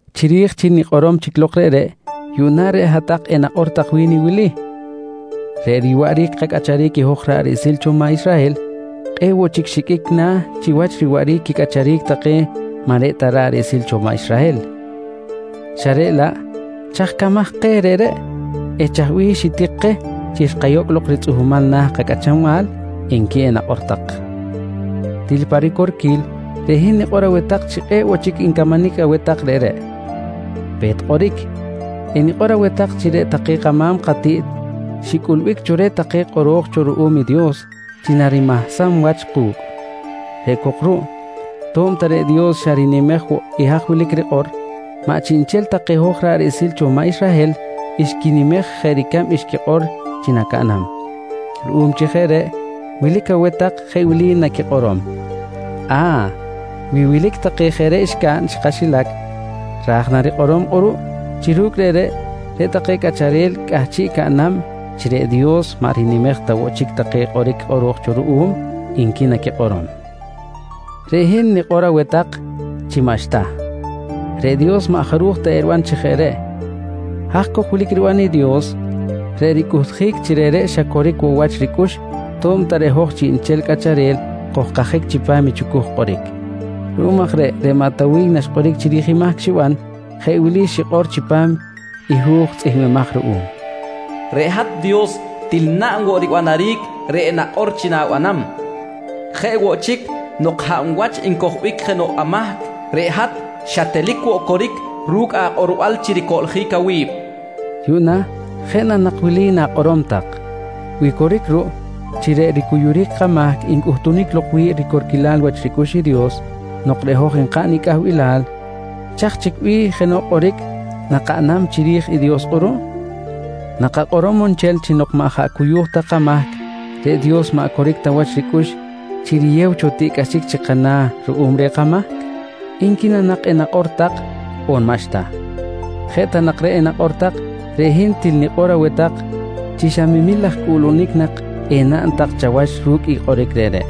Chiri̱j chi nikꞌorom chic lok reꞌreꞌ, yuꞌna reꞌ hat-tak enakꞌor tak wi̱n i wili: «Reꞌ riwaꞌric kacꞌacharic i hoj ra̱ꞌ riꞌsil cho maꞌ Israhel kꞌe̱ꞌ woꞌ chic xiqꞌuic na̱ chiwach riwaꞌric quicꞌacharic take maꞌ reꞌ ta ra̱ꞌ riꞌsil cho maꞌ Israhel xa reꞌ laꞌ, chaj camaj keh reꞌreꞌ eh chaj bih xitik keh chi xkayocꞌ ritzꞌuhmal na̱ i kacꞌachanbal? nqui enakꞌor tak. Til pa ricorquil, reꞌ hin nikꞌor aweh tak chi kꞌe̱ꞌ woꞌ chic ncamanic aweh tak reꞌreꞌ. Pe̱t kꞌoric, enikꞌor aweh tak chi reꞌ take kama̱m katiꞌt xicꞌulbic cho reh take kꞌoro̱j cho ruꞌum i Dios chi narimahsam wach ku̱cꞌ. Reꞌ cok ruꞌ to̱b ta reꞌ Dios xa rinimej woꞌ i haj wilic i rikꞌor, maꞌ chiꞌnchel ta keh hoj ra̱ꞌ riꞌsil cho maꞌ Israhel xquinimej jeꞌ ricab xquikꞌor chi nacaꞌnam. Ruꞌum chi jeꞌ reꞌ wilic aweh tak jeꞌ wili naquikꞌorom: «A̱, wi wilic take jeꞌ reꞌ xcaꞌn chi kaxilac, ra̱j na rikꞌorom kꞌuruꞌ chi ru̱cꞌ reꞌreꞌ, reꞌ take cꞌacharel cꞌahchiꞌ caꞌnam chi reꞌ Dios maꞌ rinimej ta woꞌ chic take kꞌoric kꞌoro̱j cho ruꞌum? nqui naquikꞌorom. «Reꞌ hin nikꞌor aweh tak chi maꞌxta. Reꞌ Dios maꞌ jaruj ta eriban chi jeꞌ reꞌ. Haj cok wilic riban i Dios, reꞌ ricꞌuhtjic chi reꞌreꞌ xa coric woꞌ wach ricꞌux to̱b ta reꞌ hoj chiꞌnchel cꞌacharel kojkajic chipam i chucuj kꞌoric. Ruꞌum aj reꞌ, reꞌ maꞌ Tawiy naxkꞌoric chiri̱j mahc xiban jeꞌ wili xikꞌor chipam i hu̱j tzꞌihmbimaj ruꞌum: «Reꞌ hat Dios til naꞌn woꞌ ribanaric reꞌ nakꞌor chi na̱banam. Jeꞌ woꞌ chic nok hab wach ncojbic jenoꞌ amahc, reꞌ hat xatelic woꞌ coric ru̱cꞌ akꞌorbal chi ricoꞌljic awi̱b, nqui xikꞌor. Yuꞌna jeꞌ na nak wili na̱kꞌorom tak: «Wi coric ruꞌ chi reꞌ ricuyuric kamahc ncꞌuhtunic lok wi̱ꞌ ricorquilal wach ricꞌux i Dios nok reꞌ hoj nkaꞌn i cꞌahbilal, chaj chic bih jenoꞌ kꞌoric nakaꞌnam chiri̱j i Dios kꞌuruꞌ? Nakakꞌorom on nchel chi nok maꞌ jaꞌ cuyu̱j ta kamahc reꞌ Dios maꞌ coric ta wach ricꞌux chi riyew cho tiꞌcꞌaxic chi kana̱ ruꞌum reh kamahc? nqui na nak enakꞌor tak on maꞌxta? Jeꞌ ta nak reꞌ enakꞌor tak, reꞌ hin til nikꞌor aweh tak chi xa memil laj cꞌuꞌlunic nak enaꞌn tak chawach ru̱cꞌ i kꞌoric reꞌreꞌ.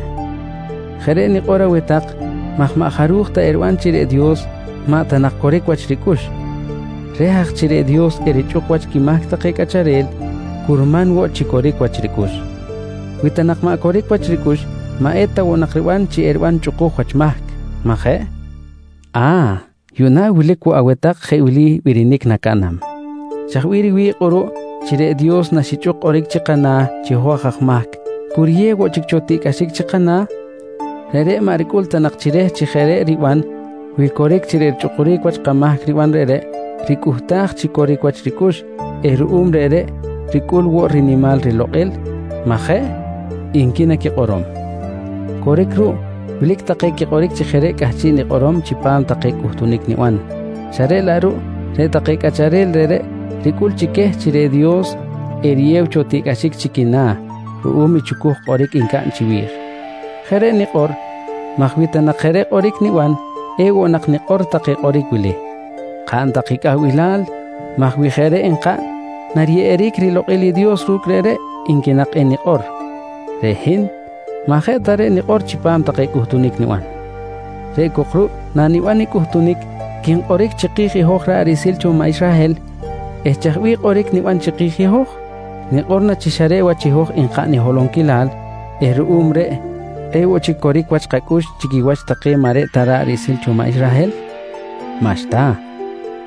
Jeꞌ reꞌ nikꞌor aweh tak maj maꞌ jaruj ta eriban chi reꞌ Dios maꞌ ta nak coric wach ricꞌux! Reh aj chi reꞌ Dios erichꞌuk wach quimahc take cꞌacharel curman woꞌ chi coric wach ricꞌux. Wi ta nak maꞌ coric wach ricꞌux, maꞌ eta woꞌ nak riban chi eriban chꞌukuj wach mahc, majeꞌ? A̱, yuꞌna wilic woꞌ aweh tak jeꞌ wili birinic nacaꞌnam: «Chaj bih riwi̱ꞌ kꞌuruꞌ chi reꞌ Dios naxichꞌuk kꞌoric chi kana̱ chi hoj aj mahc cu riyew woꞌ chic cho tiꞌcꞌaxic chi kana̱? Reꞌreꞌ maꞌ ricꞌul ta nak chi reh chi jeꞌ reꞌ riban wi coric chi reꞌ richꞌukuric wach kamahc riban reꞌreꞌ ricꞌuhtaj chi coric wach ricꞌux eh ruꞌum reꞌreꞌ ricꞌul woꞌ rinimal rilokꞌil, maꞌ jeꞌ? nqui naquikꞌorom. Coric ruꞌ, wilic take quikꞌoric chi jeꞌ reꞌ cꞌahchiꞌ nikꞌorom chipam take cꞌuhtunic niban, xa reꞌ laꞌ ruꞌ reꞌ take cꞌacharel reꞌreꞌ ricꞌul chi queh chi reꞌ Dios eriyew cho tiꞌcꞌaxic chi quina̱ ruꞌum i chucuj kꞌoric ncaꞌn chiwi̱j. Jeꞌ reꞌ nikꞌor maj wi ta nak jeꞌ reꞌ kꞌoric niban, ewoꞌ nak nikꞌor take kꞌoric wili: «Kaꞌn tak i cꞌahbilal maj wi jeꞌ reꞌ nkaꞌn nariyeꞌeric rilokꞌil i Dios ru̱cꞌ reꞌreꞌ, nqui nak enikꞌor. Reꞌ hin maꞌ jeꞌ ta reꞌ nikꞌor chipam take cꞌuhtunic niban. Reꞌ cok ruꞌ naniban i cꞌuhtunic, quinkꞌoric chiki̱j i hoj ra̱ꞌ riꞌsil cho maꞌ Israhel eh chaj bih kꞌoric niban chiki̱j i hoj? Nikꞌor na chi xa reꞌ wach i hoj nkaꞌn i holonquilal eh ruꞌum reꞌ kꞌe̱ꞌ woꞌ chic coric wach kacꞌux chi quiwach take maꞌ reꞌ ta take ra̱ꞌ riꞌsil cho maꞌ Israhel? Maꞌxta,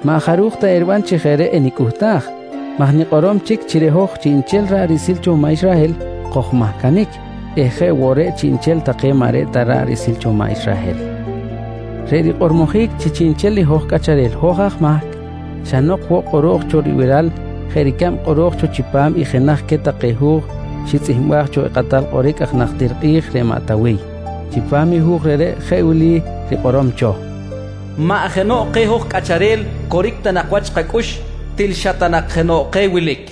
maꞌ jaruj ta eriban chi jeꞌ reꞌ enicꞌuhtaj maj nikꞌorom chic chi reꞌ hoj chiꞌnchel ra̱ꞌ riꞌsil cho maꞌ Israhel kojmahcanic eh jeꞌ woꞌ reꞌ chiꞌnchel take maꞌ reꞌ ta ra̱ꞌ riꞌsil cho maꞌ Israhel. Reꞌ rikꞌormojic chi chiꞌnchel i hoj cꞌacharel hoj aj mahc, xa nok woꞌ kꞌoro̱j cho ribiral jeꞌ ricab kꞌoro̱j cho chipam i jenaj queh take hu̱j xitzꞌihmbaj cho i kakꞌatal kꞌoric najtir kꞌi̱j reꞌ maꞌ Tawiy. Chipam i hu̱j reꞌreꞌ jeꞌ wili rikꞌorom cho: “Maꞌ jenoꞌ keh hoj cꞌacharel coric ta nak wach kacꞌux. Til xa ta nak jenoꞌ keh wilic.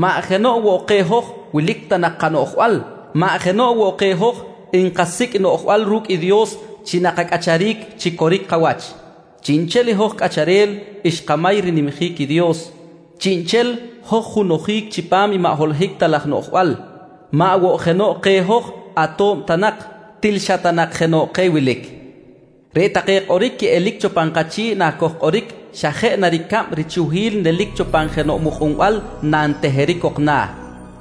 Maꞌ jenoꞌ woꞌ keh hoj wilic ta nak kanoꞌjbal. Maꞌ jenoꞌ woꞌ keh hoj nkasicꞌ i noꞌjbal ru̱cꞌ i Dios chi nakacꞌacharic chi coric kawach. Chiꞌnchel i hoj cꞌacharel xkamay rinimjic i Dios. Chiꞌnchel hoj junojic chipam i maꞌ holohic ta laj noꞌjbal. Maꞌ woꞌ jenoꞌ keh hoj ato̱b ta nak. Til xa ta nak je jenoꞌ keh wilic. Reꞌ take kꞌoric quiꞌelic cho pan kachi̱ꞌ nakojkꞌoric, xa jeꞌ na ricab richuhquil nelic cho pan jenoꞌ mukꞌunbal nanteheric cok na̱.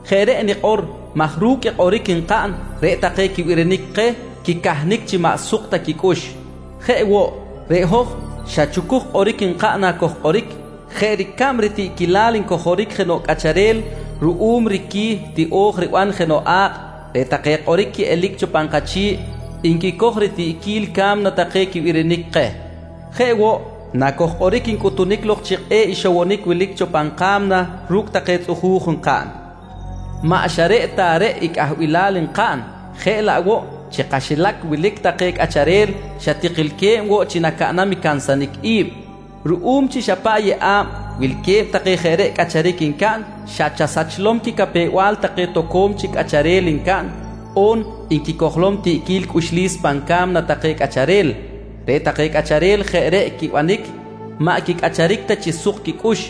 Jeꞌ reꞌ nikꞌor maj ru̱cꞌ i kꞌoric nkaꞌn reꞌ take quibirinic keh quicahnic chi maꞌ suk ta quicꞌux. Jeꞌ woꞌ, reꞌ hoj xa chucuj kꞌoric nkaꞌn nakojkꞌoric. Jeꞌ ricab i ritiꞌquilal ncojoric jenoꞌ cꞌacharel ruꞌum i riqui̱ tiꞌo̱j riban jenoꞌ a̱kꞌ, reꞌ take kꞌoric quiꞌelic cho pan kachi̱ꞌ nquicoj ritiꞌquil ca̱mna take quibirinic keh. Jeꞌ woꞌ nakojkꞌoric, ncꞌutunic lok chi kꞌe̱ꞌ ixowonic wilic cho pan ka̱mna ru̱cꞌ take tzꞌuju̱j nkaꞌn. Maꞌ xa reꞌ ta reꞌ i cꞌahbilal nkaꞌn jeꞌ laꞌ woꞌ chi kaxilac wilic take cꞌacharel xa tikilque̱b woꞌ chi nacaꞌnam i cansanic i̱b. Ruꞌum chi xa paꞌ yeꞌa̱b wilque̱b take jeꞌ reꞌ cꞌacharic ncaꞌn, xa chasachlom quicapew-bal take toco̱m chic cꞌacharel ncaꞌn on nquicojlom tiꞌquil cꞌuxlis pan ca̱mna take cꞌacharel. Reꞌ take cꞌacharel jeꞌ reꞌ quibanic maꞌ quicꞌacharic ta chi suk quicꞌux.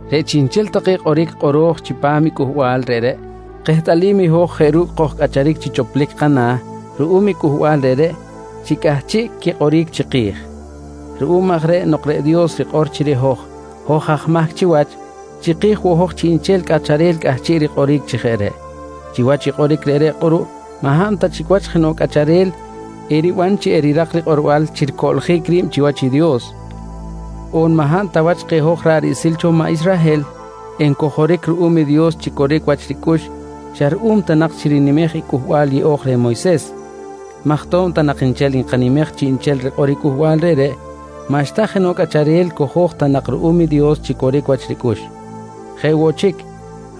Reꞌ chiꞌnchel take kꞌoric kꞌoro̱j chipam i cꞌuhbal reꞌreꞌ kehtꞌalim i hoj jeꞌ ru̱cꞌ kojcꞌacharic chi choplic kana̱ ruꞌum i cꞌuhbal reꞌreꞌ chi cꞌahchiꞌ quikꞌoric chiki̱j. Ruꞌum aj reꞌ nok reꞌ Dios rikꞌor chi reꞌ hoj, hoj aj mahc chiwach, chiki̱j woꞌ hoj chiꞌnchel cꞌacharel cꞌahchiꞌ rikꞌoric chi jeꞌ reꞌ. Chiwach i kꞌoric reꞌreꞌ kꞌuruꞌ maꞌ hab ta chic wach jenoꞌ cꞌacharel eriban chi erirak rikꞌorbal chi ricoꞌljic ri̱b chiwach i Dios, on maꞌ hab ta wach keh hoj ra̱ꞌ riꞌsil cho maꞌ Israhel ncojoric ruꞌum i Dios chi coric wach ricꞌux xa ruꞌum ta nak chi rinimej i Cꞌuhbal Yeꞌo̱j reh Moyses maj to̱b ta nak nchel nkanimej chiꞌnchel rikꞌor i cꞌuhbal reꞌreꞌ maꞌxta jenoꞌ cꞌacharel cojo̱j ta nak ruꞌum i Dios chi coric wach ricꞌux. Jeꞌ woꞌ chic,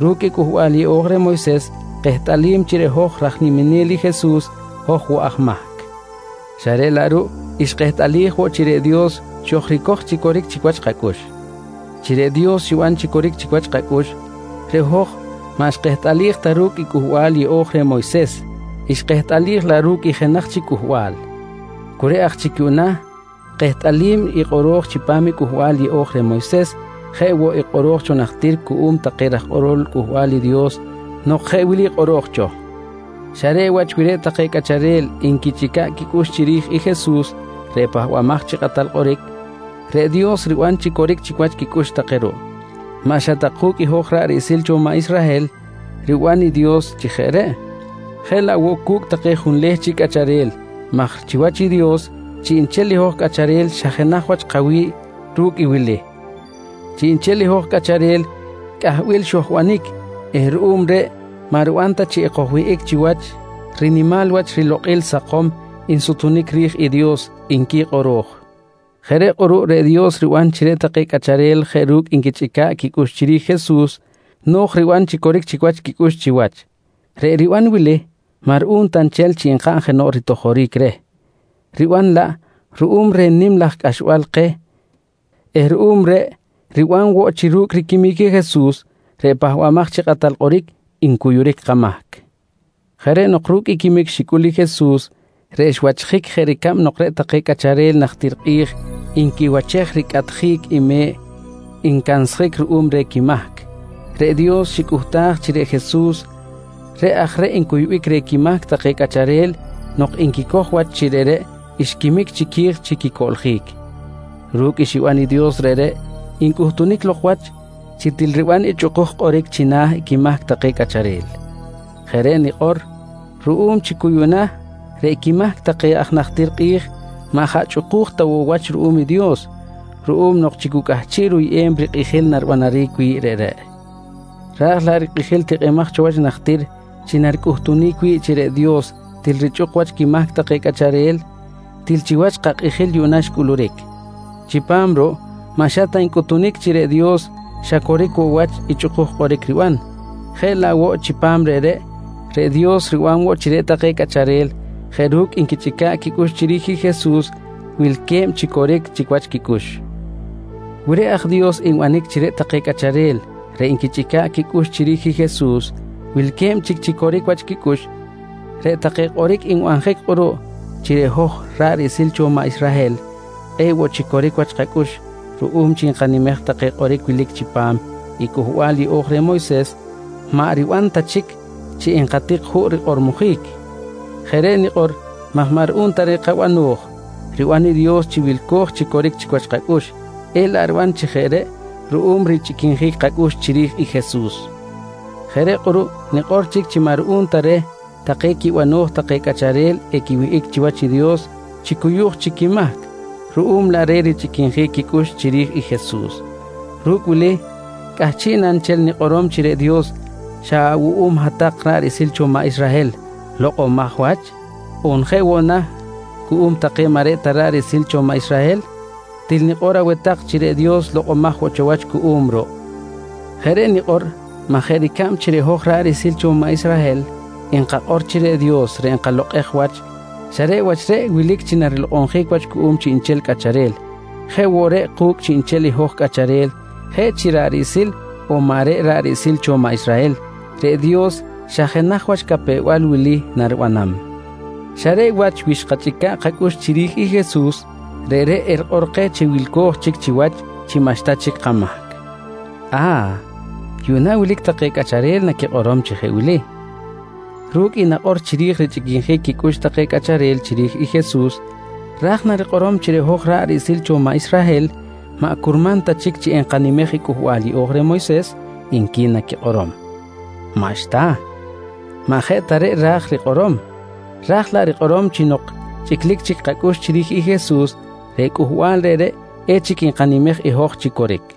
ru̱cꞌ i Cꞌuhbal Yeꞌo̱j reh Moyses kehtꞌalim chi reꞌ hoj raj niminel i Jesus hoj woꞌ aj mahc xa reꞌ laꞌ ruꞌ xkehtꞌalij woꞌ chi reꞌ Dios xojricoj chi coric chic wach kacꞌux. Chi reꞌ Dios xiban chi coric chic wach kacꞌux reꞌ hoj maꞌ xkehtꞌalij ta ru̱cꞌ i Cꞌuhbal Yeꞌo̱j reh Moyses, xkehtꞌalij laꞌ ru̱cꞌ i jenaj chic cꞌuhbal. Cu reꞌ aj chic yuꞌna kehtꞌalim i kꞌoro̱j cho chipam i Cꞌuhbal Yeꞌo̱j reh Moyses jeꞌ woꞌ i kꞌoro̱j cho najtir cuꞌum take raj kꞌorol Cꞌuhbal i Dios nok jeꞌ wili kꞌoro̱j cho: «Xa reꞌ wach wi reꞌ take cꞌacharel nquichꞌica̱ꞌ quicꞌux chiri̱j i Jesus reꞌ Pahbamaj chi Kꞌatal Kꞌoric, reꞌ Dios riban chi coric chic wach quicꞌux take ruꞌ. Maꞌ xa ta ku̱cꞌ i hoj ra̱ꞌ riꞌsil cho maꞌ Israhel riban i Dios chi jeꞌ reꞌ, jeꞌ laꞌ woꞌ cu̱cꞌ take junleh chic cꞌacharel maj chiwach i Dios chiꞌnchel i hoj cꞌacharel xa jenaj wach kawi̱ꞌ ru̱cꞌ i wili: Chiꞌnchel i hoj cꞌacharel cꞌahbil xojbanic eh ruꞌum reꞌ maꞌ riban ta chi ekojwihꞌic chiwach rinimal wach rilokꞌil sakom nsutunic ri̱j i Dios, nqui kꞌoro̱j. Jeꞌ reꞌ kꞌuruꞌ reꞌ Dios riban chi reꞌ take cꞌacharel jeꞌ ru̱cꞌ nquichꞌica̱ꞌ quicꞌux chiri̱j i Jesus no̱j riban chi coric chic wach quicꞌux chiwach. Reꞌ riban wili maꞌ ruꞌum ta nchel chi nkaꞌn jenoꞌ ritojoric reh, riban laꞌ ruꞌum reh nim laj cꞌaxbal keh eh ruꞌum reꞌ riban woꞌ chi ru̱cꞌ riquimic i Jesus reꞌ Pahbamaj chi Kꞌatal Kꞌoric ncuyuric kamahc. Jeꞌ reꞌ nok ru̱cꞌ i quimic xicꞌul i Jesus reꞌ xwachjic jeꞌ ricab nok reꞌ take cꞌacharel najtir kꞌi̱j nquiwachej ricꞌatjic i me̱ꞌ ncansjic ruꞌum reh quimahc, reꞌ Dios xicꞌuhtaj chi reꞌ Jesus reꞌ aj reꞌ ncuybic reh quimahc take cꞌacharel nok nquicoj wach chi reꞌreꞌ xquimic chiqui̱j chi quicoꞌljic. Ru̱cꞌ xiban i Dios reꞌreꞌ, ncꞌuhtunic lok wach chi til riban i chꞌukuj kꞌoric china̱ i quimahc take cꞌacharel. Jeꞌ reꞌ nikꞌor ruꞌum chi cu yuꞌna reꞌ quimahc take aj najtir kꞌi̱j maꞌ jaꞌ chꞌuku̱j ta woꞌ wach ruꞌum i Dios ruꞌum nok chi cu cꞌahchiꞌ ruyꞌem rikꞌijil naribanaric wi̱ꞌ reꞌreꞌ. Raj laꞌ i rikꞌijil tikꞌimaj cho wach najtir chi naricꞌuhtunic wi̱ꞌ chi reꞌ Dios til richꞌuk wach quimahc take cꞌacharel, til chiwach kakꞌijil yuꞌna xcꞌuluric. Chipam ruꞌ maꞌ xa ta ncꞌuhtunic chi reꞌ Dios xa coric woꞌ wach i chꞌukuj kꞌoric riban jeꞌ laꞌ woꞌ chipam reꞌreꞌ, reꞌ Dios riban woꞌ chi reꞌ take cꞌacharel jeꞌ ru̱cꞌ nquichꞌica̱ꞌ quicꞌux chiri̱j i Jesus wilque̱b chi coric chic wach quicꞌux. Wi reꞌ aj Dios nbanic chi reꞌ take cꞌacharel reꞌ nquichꞌica̱ꞌ quicꞌux chiri̱j i Jesus wilque̱b chi coric chic wach quicꞌux, reꞌ take kꞌoric nbanjic kꞌuruꞌ chi reꞌ hoj ra̱ꞌ riꞌsil cho maꞌ Israhel kꞌe̱ꞌ woꞌ chic coric wach kacꞌux ruꞌum chi nkanimej take kꞌoric wilic chipam i Cꞌuhbal Yeꞌo̱j reh Moyses maꞌ riban ta chic chi nkatik juꞌ rikꞌormojic. Jeꞌ reꞌ nikꞌor maj maꞌ ruꞌum ta reh kabano̱j riban i Dios chi wilco̱j chi coric chic wach kacꞌux, elaꞌ riban chi jeꞌ reꞌ ruꞌum richꞌiquinjic kacꞌux chiri̱j i Jesus. Jeꞌ reꞌ kꞌuruꞌ nikꞌor chic chi maꞌ ruꞌum ta reh take quibano̱j take cꞌacharel equiwihꞌic chiwach i Dios chi cuyu̱j chic quimahc ruꞌum laꞌ reh richꞌiquinjic quicꞌux chiri̱j i Jesus. Ru̱cꞌ wili cꞌahchiꞌ na nchel nikꞌorom chi reꞌ Dios xa awuꞌum hat-tak ra̱ꞌ riꞌsil cho maꞌ Israhel lokꞌomaj wach? On jeꞌ woꞌ na cuꞌum take maꞌ reꞌ ta ra̱ꞌ riꞌsil cho maꞌ Israhel? Til nikꞌor aweh tak chi reꞌ Dios lokꞌomaj woꞌ wach cuꞌum ruꞌ! Jeꞌ reꞌ nikꞌor maj jeꞌ ricab chi reꞌ hoj ra̱ꞌ riꞌsil cho maꞌ Israhel nkakꞌor chi reꞌ Dios reꞌ nkalokꞌej wach xa reꞌ wach reꞌ wilic chi narilokꞌonjic wach cuꞌum chiꞌnchel cꞌacharel, jeꞌ woꞌ reꞌ ku̱cꞌ chiꞌnchel i hoj cꞌacharel jeꞌ chi ra̱ꞌ riꞌsil on maꞌ reꞌ ra̱ꞌ riꞌsil cho maꞌ Israhel, reꞌ Dios xa jenaj wach i capew-bal wili naribanam: Xa reꞌ wach wi xkachꞌica̱ꞌ kacꞌux chiri̱j i Jesus, reꞌreꞌ erikꞌor keh chi wilco̱j chic chiwach chi maꞌxta chic kamahc. A̱, yuꞌna wilic take cꞌacharel naquikꞌorom chi jeꞌ wili: «Ru̱cꞌ i nakꞌor chiri̱j richꞌiquinjic quicꞌux take cꞌacharel chiri̱j i Jesus, ra̱j na rikꞌorom chi reꞌ hoj ra̱ꞌ riꞌsil cho maꞌ Israhel maꞌ curman ta chic chi enkanimej i Cꞌuhbal Yeꞌo̱j reh Moyses? nqui naquikꞌorom. Maꞌxta, maꞌ jeꞌ ta reꞌ ra̱j rikꞌorom. Ra̱j laꞌ rikꞌorom chi nok chꞌiclic chic kacꞌux chiri̱j i Jesus, reꞌ cꞌuhbal reꞌreꞌ echic nkanimej i hoj chi coric.